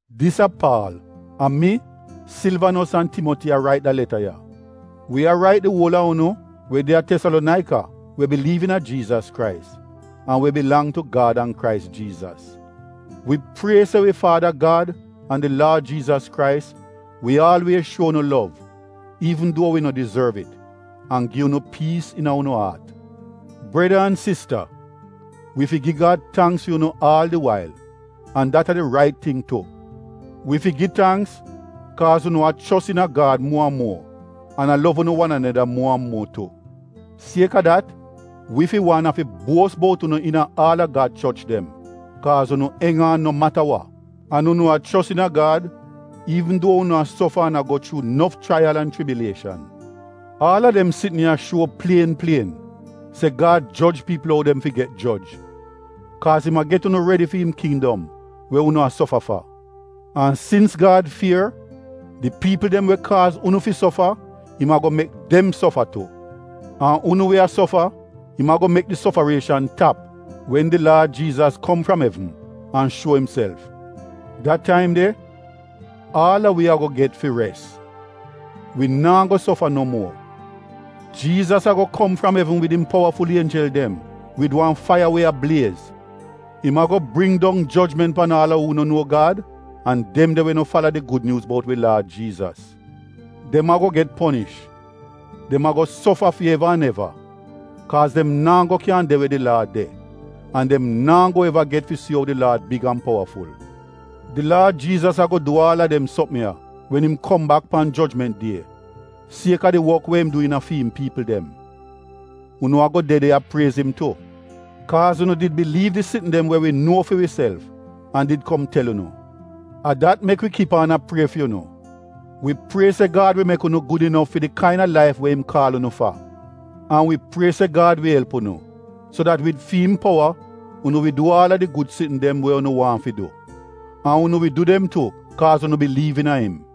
Dis a Paal. A mi, Silvanos an Timoti a rait da leta ya. Wi a rait di uol a unu we de a Tesalonaika we biliiv iina Jiizas Krais, an we bilang tu Gad an Krais Jiizas. Wi prie se wi Faada Gad an di Laad Jiizas Krais wi aalwiez shuo unu lov, we wi no dizorv, an gi unu piis iina unu aat. Breda an sista, wi fi gi Gad tangks fi unu aal di wail — an dat a di rait ting tu. Wi fi gi tangks, kaaz unu a chos iina Gad muo an muo an a lov unu wan aneda muo an muo tu. Sieka dat, wi fi wan afi buos bout unu iina aal a Gad choch dem, kaaz unu eng aan no mata wa. An unu a chos iina Gad iivn duo unu a sofa an a go chuu nof chraiyal an chibilieshan. Aal a dem sitn ya shuo plien plien se Gad joj piipl ou dem fi get joj, kaaz im a get unu redi fi im kindom we unu a sofa fa. An sins Gad fier, di piipl dem we kaaz unu fi sofa, im ago mek dem sofa tu. An unu we a sofa, im ago mek di sofarieshan tap wen di Laad Jiizas kom fram evn an shuo imself. Da taim de aal a wi ago get fi res, wi naa go sofa no muo. Jiizas ago kom fram evn wid im powaful ienjel dem, wid wan faiya we a bliez. Im ago bring dong jojment pan aal a uu no nuo Gad an dem de we no fala di Gud Nyuuz bout wi Laad Jiizas. Dem ago get ponish. Dem ago sofa fi eva an eva, kaaz dem naa go kyan de we di Laad de, an dem naa go eva get fi si ou di Laad big an powaful. Di Laad Jiizas ago du aal a dem sopm ya wen im kom bak pan jojment die fi get priez sieka di wok we im du iina fi im piipl dem. Unu ago de de a priez im tu. Kaaz unu did biliiv di sitn dem we wi nuo fi wiself an did kom tel unu. A dat mek wi kip aan a prie fi unu. Wi prie se Gad wi mek unu gud inof fi di kaina laif we im kaal unu fa. An wi prie se Gad wi elp unu so dat wid fi im powa unu wi du aal a di gud sitn dem we unu waahn fi du, an unu wi du dem tu kaaz unu biliiv iina im.